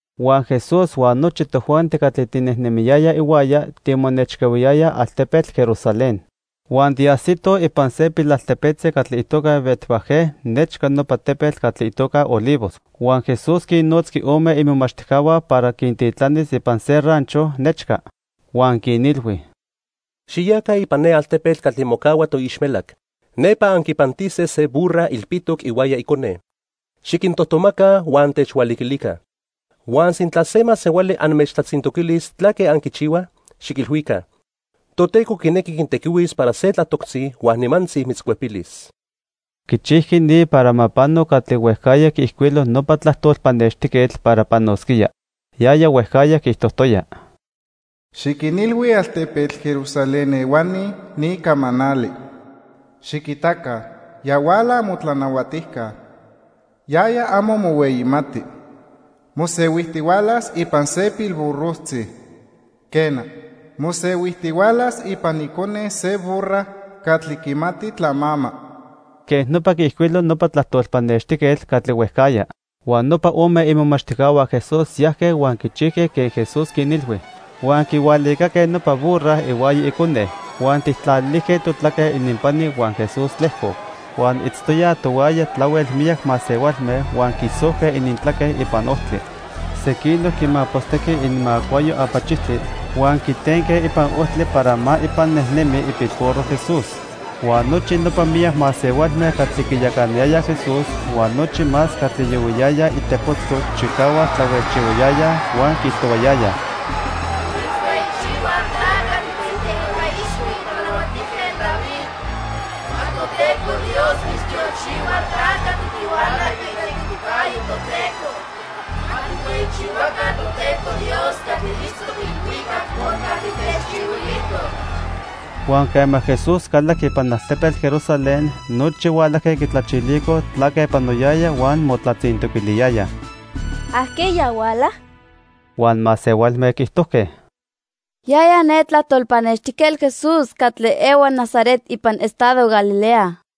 Huan Jesús huan nochi tojuanti catli tinejnemiyayaj ihuaya timonechcahuiyayaj altepetl Jerusalén. Huan tiajsitoj ipan se pilaltepetzi catli itoca Betfagé, nechca nopa tepetl catli itoca Olivos. Huan Jesús quinnotzqui ome imomachtijcahua para quintitlanis ipan se rancho nechca. Huan quinilhui: —Xiyaca ipan ne altepetl catli mocahua toixmelac. Nepa anquipantise se burra ilpitoc ihuaya icone. Xiquintojtomaca huan techhualiquilica. Huan sintla se masehuali anmechtlatzintoquilis tlaque anquichihuaj, xiquilhuica: 'Toteco quinequi quintequihuis para se tlatoctzi huan nimantzi mitzcuepilis.' Quichijqui ni para ma pano catli huejcajya quiijcuilo nopa tlajtol pannextijquetl para panosquía. Yaya huejcajya quiijtojtoya: "Xiquinilhui altepetl Jerusalén ehuani ni camanali: 'Xiquitaca, ya huala amotlanahuatijca. Yaya amo mohueyimati. Mosehuijtihualas ipan se pilburrojtzi. Quena, mosehuijtihualas ipan icone se burra catli quimati tlamama.' " Quej nopa quiijcuilo nopa tlajtol pannextijquetl catli huejcajya. Huan nopa ome imomachtijcahua Jesús yajque huan quichijque quen Jesús quinilhui. Huan quihualicaque nopa burra ihuaya icone. Huan tijtlalilijque totlaque ininpani huan Jesús tlejcoc. Huan itztoyaj tohuaya tlahuel miyac masehualme huan quisojque inintlaque ipan ojtli. Sequinoc quimapostejque ininmacuayo apachijtli huan quitenque ipan ojtli para ma ipan nejnemi ipilburro Jesús. Huan nochi nopa miyac masehualme catli quiyacanayayaj Jesús huan nochi más catli yohuiyayaj itepotzco chicahuac tlahuejchihuayayaj huan quiijtohuayayaj: "¡Timitzhueyichihuaj ta catli tiiteipa ixhui Tlanahuatijquetl David! ¡Ma Toteco Dios mitztiochihua ta catli tihuala ica itequiticayo Toteco! ¡Ma tijhueyichihuaca Toteco Dios catli itztoc ilhuicac por catli techchihuilijtoc!" Huan quema Jesús calajqui ipan altepetl Jerusalén, nochi hualajque quitlachilicoj tlaque panoyaya huan motlatzintoquiliyayaj: —¿Ajqueya huala? Huan masehualme quiijtojque: —Yaya ne tlajtol pannextijquetl Jesús catli ehua Nazaret ipan estado Galilea.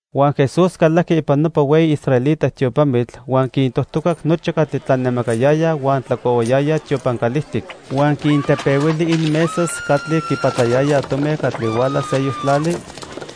Huan Jesús calajqui ipan nopa hueyi israelita tiopamitl huan quintojtocac nochi catli tlanemacayayaj huan tlacohuayayaj tiopan calijtic. Huan quintepehuili ininmesas catli quipatlayayaj tomi catli huala seyoc tlali,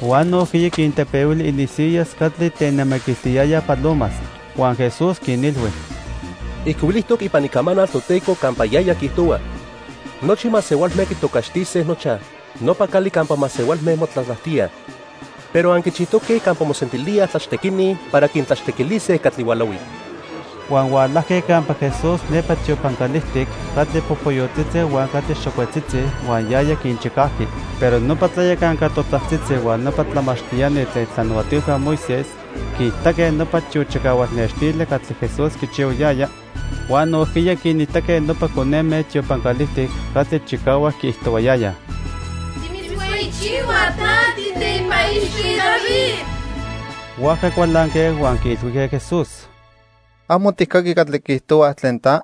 huan nojquiya quintepehuili ininsiyas catli tenemaquiltiyayaj palomas. Huan Jesús quinilhui: —Ijcuilijtoc ipan Icamanal Toteco campa yaya quiijtohua: 'Nochi masehualme quitocaxtise nochaj: Nopa Cali Campa Masehualme Motlatlajtíaj.' Pero anquichijtoque campa mosentilíaj tlachtequini para quintlachtequilise catli hualahuij. Huan hualajque campa Jesús nepa tiopan calijtic catli popoyotzitzi huan catli xocuetzitzi, huan yaya quinchicajqui. Pero nopa tlayacanca totajtzitzi huan nopa tlamachtiani tlen itlanahuatilhua Moisés quiitaque nopa tiochicahual nextili catli Jesús quichihuayaya huan nojquiya quinitaque nopa coneme tiopan calijtic catli chicahuac quiijtohuayayaj: "Timitzhueyichihuaj ta tiiteipa ixhui David." Huajca cualanque, huan quiilhuijque Jesús: —¿Amo tijcaqui catli quiijtohuaj tlen ta?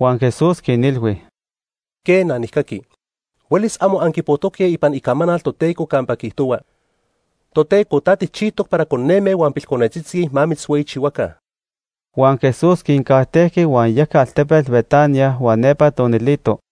Huan Jesús quinilhui: —Quena, nijcaqui. Huelis amo anquipojtoque ipan Icamanal Toteco campa quiijtohua: 'Toteco ta tijchijtoc para coneme huan pilconetzitzi ma mitzhueyichihuaca.' Huan Jesús quincajtejqui huan yajqui altepetl Betania huan nepa tonilito.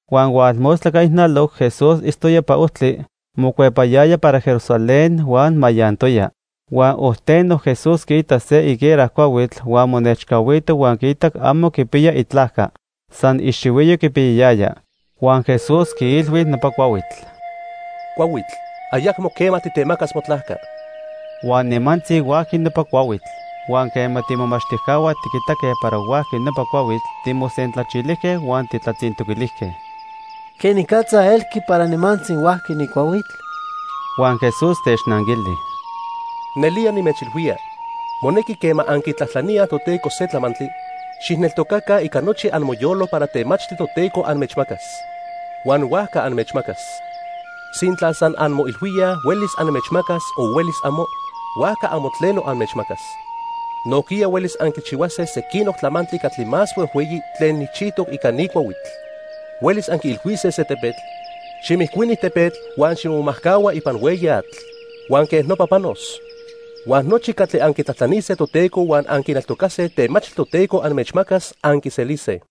Huan hualmostla ica ijnaloc Jesús itztoya ipan ojtli mocuepayaya para Jerusalén huan mayantoya. Huan ojteno Jesús quiitac se higuera cuahuitl huan monechcahuito huan quiitac amo quipiya itlajca. San ixihuiyo quipiyayaya. Huan Jesús quiilhui nopa cuahuitl: —Cuahuitl, ayacmo quema titemacas motlajca. Huan nimantzi huajqui nopa cuahuitl. Huan quema tiimomachtijcahua tiquitaque para huajqui nopa cuahuitl, timosentlachilijque huan tijtlatzintoquilijque: —¿Quenicatza elqui para nimantzi huajqui ni cuahuitl? Huan Jesús technanquili: —Nelía nimechilhuía, monequi quema anquitlajtlaníaj Toteco se tlamantli, xijneltocaca ica nochi amoyolo para temachtli Toteco anmechmacas, huan huajca anmechmacas. Sintla san anmoilhuíaj huelis anmechmacas o huelis amo, huajca amo tleno anmechmacas. Nojquiya huelis anquichihuase sequinoc tlamantli catli más huejhueyi tlen nijchijtoc ica ni cuahuitl. Huelis anquiilhuise se tepetl: 'Ximijcuini tepetl huan ximomajcahua ipan hueyi atl', huan quej nopa panos. Huan nochi catli anquitlajtlanise Toteco huan anquineltocase temachtli Toteco anmechmacas, anquiselise.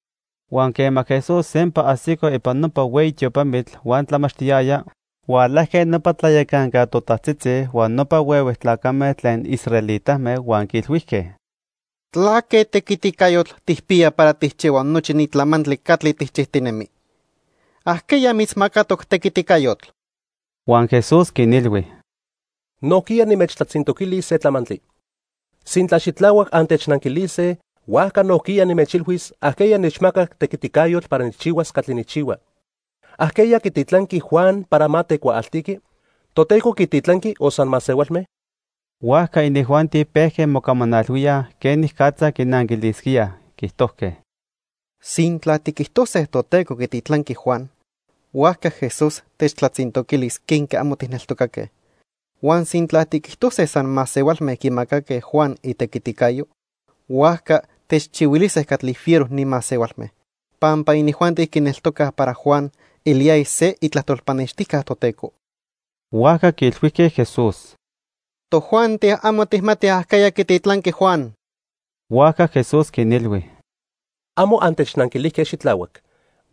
Huan quema Jesús sempa ajsico ipan nopa hueyi tiopamitl huan tlamachtiyaya, hualajque nopa tlayacanca totajtzitzi huan nopa huehue tlacame tlen israelitame huan quiilhuijque: —¿Tlaque tequiticayotl tijpiya para tijchihua nochi ni tlamantli catli tijchijtinemi? ¿Ajqueya mitzmacatoc tequiticayotl? Huan Jesús quinilhui: —Nojquiya nimechtlatzintoquilis se tlamantli. Sintla xitlahuac antechnanquilise, huajca nojquiya nimechilhuis ajqueya nechmacac tequiticayotl para nijchihuas catli nijchihua. ¿Ajqueya quititlanqui Juan para ma tecuaaltiqui? ¿Toteco quititlanqui o san masehualme? Huajca inijuanti pejque mocamanalhuíaj quenicatza quinanquilisquíaj. Quiijtojque: —Sintla tiquijtose Toteco quititlanqui Juan, huajca Jesús techtlatzintoquilis quenque amo tijneltocaque. Huan sintla tiquijtose san masehualme quimacaque Juan itequiticayo, huajca techchihuilise catli fiero ni masehualme, pampa inijuanti quineltocaj para Juan eliyaya se itlajtol pannextijca Toteco. Huajca quiilhuijque Jesús: —Tojuanti amo tijmatij ajqueya quititlanqui Juan. Huajca Jesús quinilhui: —Amo antechnanquilijque xitlahuac,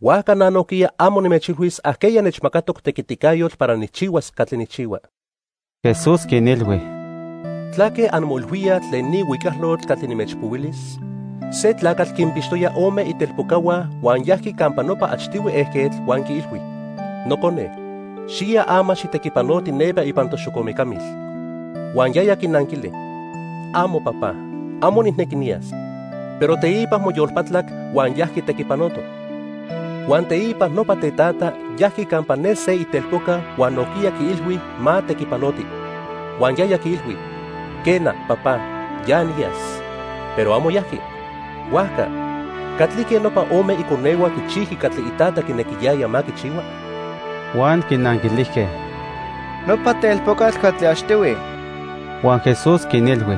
huajca na nojquiya amo nimechilhuis ajqueya nechmacatoc tequiticayotl para nijchihuas catli nijchihua. Jesús quinilhui: —¿Tlaque anmoilhuíaj tlen ni huicalotl catli nimechpohuilis? Se tlacatl quinpixtoya ome itelpocahua huan yajqui campa nopa achtihui ejquetl huan quiilhui: 'Nocone, xiya ama xitequipanoti nepa ipan toxocomecamil.' Huan yaya quinanquili: 'Amo, Papá, amo nijnequi niyas.' Pero teipa moyolpatlac huan yajqui tequipanoto. Huan teipa nopa tetata yajqui campa ne se itelpoca huan nojquiya quiilhui ma tequipanoti. Huan yaya quiilhui: 'Quena, Papá, ya niyas.' Pero amo yajqui. Huajca, ¿catlique nopa ome iconehua quichijqui catli itata quinequiyaya ma quichihua? Huan quinanquilijque: —Nopa telpocatl catli achtihui. Huan Jesús quinilhui: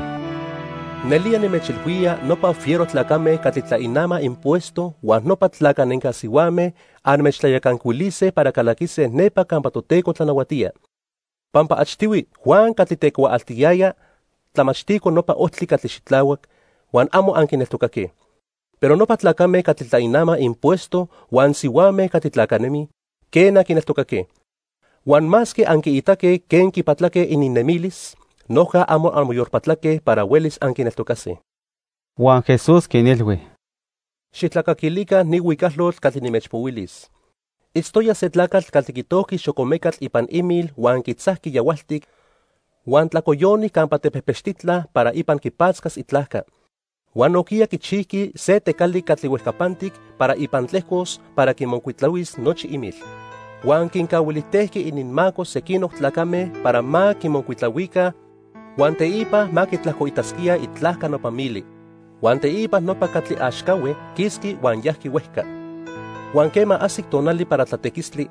—Nelía nimechilhuía nopa fiero tlacame catli tlainamaj impuesto huan nopa tlacanenca sihuame anmechtlayacancuilise para calaquise nepa campa Toteco tlanahuatía. Pampa achtihui Juan catli tecuaaltiyaya tlamachtico nopa ojtli catli xitlahuac, huan amo anquineltocaque. Pero nopa tlacame catli tlainamaj impuesto huan sihuame catli tlacanemij, quena, quineltocaque. Huan masque anquiitaque quen quipatlaque ininnemilis, noja amo anmoyolpatlaque para huelis anquineltocase. Huan Jesús quinilhui: —Xijtlacaquilica ni huicalotl catli nimechpohuilis. Itztoya se tlacatl catli quitojqui xocomecatl ipan imil huan quitzajqui yahualtic huan tlacoyoni campa tepejpechtitla para ipan quipatzcas itlajca. Huan nojquiya quichijqui se tecali catli huejcapantic para ipan tlejcos para quimocuitlahuis nochi imil. Huan quincahuilijtejqui ininmaco sequinoc tlacame para ma quimocuitlahuica huan teipa ma quitlajcoitasquíaj itlajca nopa mili. Huan teipa nopa catli axcahue quisqui huan yajqui huejca. Huan quema ajsic tonali para tlatequistli,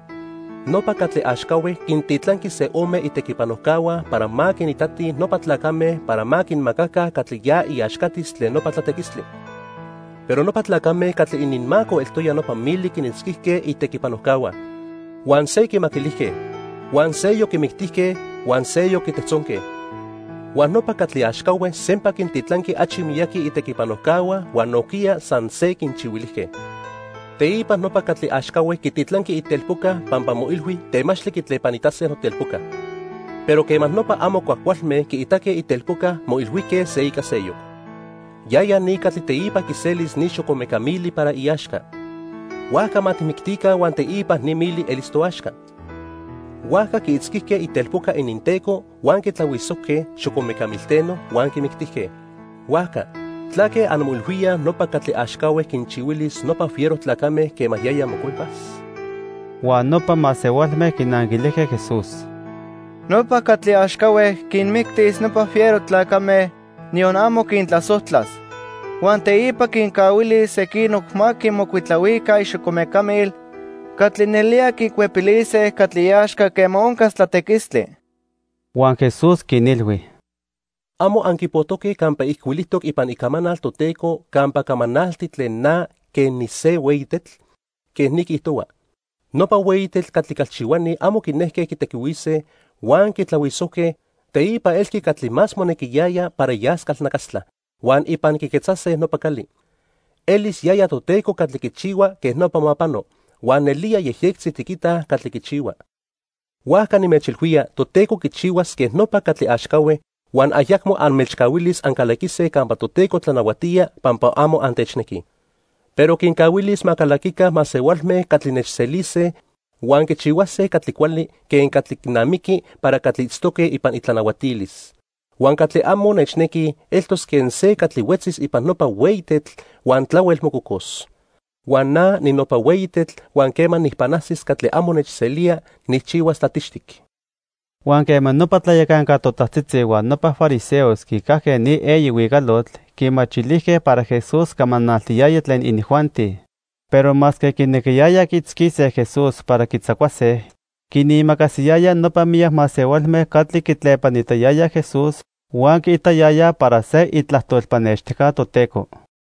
nopa catli axcahue quintitlanqui se ome itequipanojcahua para ma quinitatij nopa tlacame para ma quinmacaca catli ya iaxcatis tlen nopa tlatequistli. Pero nopa tlacame catli ininmaco eltoya nopa mili quinitzquijque itequipanojcahua. Huan se quimaquilijque, huan seyoc quimictijque huan seyoc quitejtzonque. Huan nopa catli axcahue sempa quintitlanqui achi miyaqui itequipanojcahua huan nojquiya san se quinchihuilijque. "Teipa nopa catli axcahue quititlanqui itelpoca pampa moilhui temachtli quitlepanitase notelpoca. Pero quema nopa amo cuajcualme quiitaque itelpoca, moilhuijque se ica seyoc: 'Yaya ni catli teipa quiselis ni xocomeca mili para iaxca. Huajca ma tijmictica huan teipa ni mili elis toaxca.' Huajca quiitzquijque itelpoca ininteco huan quitlahuisojque xocomeca milteno huan quimictijque. "Huajca, ¿tlaque anmoilhuíaj nopa catli axcahue quinchihuilis nopa fiero tlacame quema yaya mocuepas?" Huan nopa masehualme quinanquilijque Jesús: —Nopa catli axcahue quinmictis nopa fiero tlacame, niyon amo quintlasojtlas. Huan teipa quincahuilis sequinoc ma quimocuitlahuica ixocomecamil catli nelía quicuepilise catli iaxca quema oncas tlatequistli. Huan Jesús quinilhui: —¿Amo anquipojtoque campa ijcuilijtoc ipan Icamanal Toteco campa camanalti tlen na quen nise hueyi tetl? Quej ni quiijtohua: 'Nopa hueyi tetl catli calchihuani amo quinejque quitequihuise, huan quitlahuisojque, teipa elqui catli más monequiyaya para yas calnacastla, huan ipan quiquetzase nopa cali. Elis yaya Toteco catli quichihua quej nopa ma pano, huan nelía yejyectzi tiquitaj catli quichihua.' Huajca nimechilhuía Toteco quichihuas quen nopa catli axcahue huan ayacmo anmechcahuilis ancalaquise campa Toteco tlanahuatía pampa amo antechnequij, pero quincahuilis ma calaquica masehualme catli nechselise huan quichihuase catli cuali quen catli quinamiqui para catli itztoque ipan itlanahuatilis. Huan catli amo nechnequi eltos quen se catli huetzis ipan nopa hueyi tetl huan tlahuel mococos. Huan na ninopa hueyi tetl huan quema nijpanajsis catli amo nechselía, nijchihuas tlatixtic. Huan quema nopa tlayacanca totajtzitzi huan nopa fariseos quicajque ni eyi huicalotl, quimachilijque para Jesús camanaltiyaya tlen inijuanti. Pero masque quinequiyayaj quiitzquise Jesús para quitzacuase, quinimacasiyayaj nopa miyac masehualme catli quitlepanitayayaj Jesús huan quiitayayaj para se itlajtol pannextijca Toteco.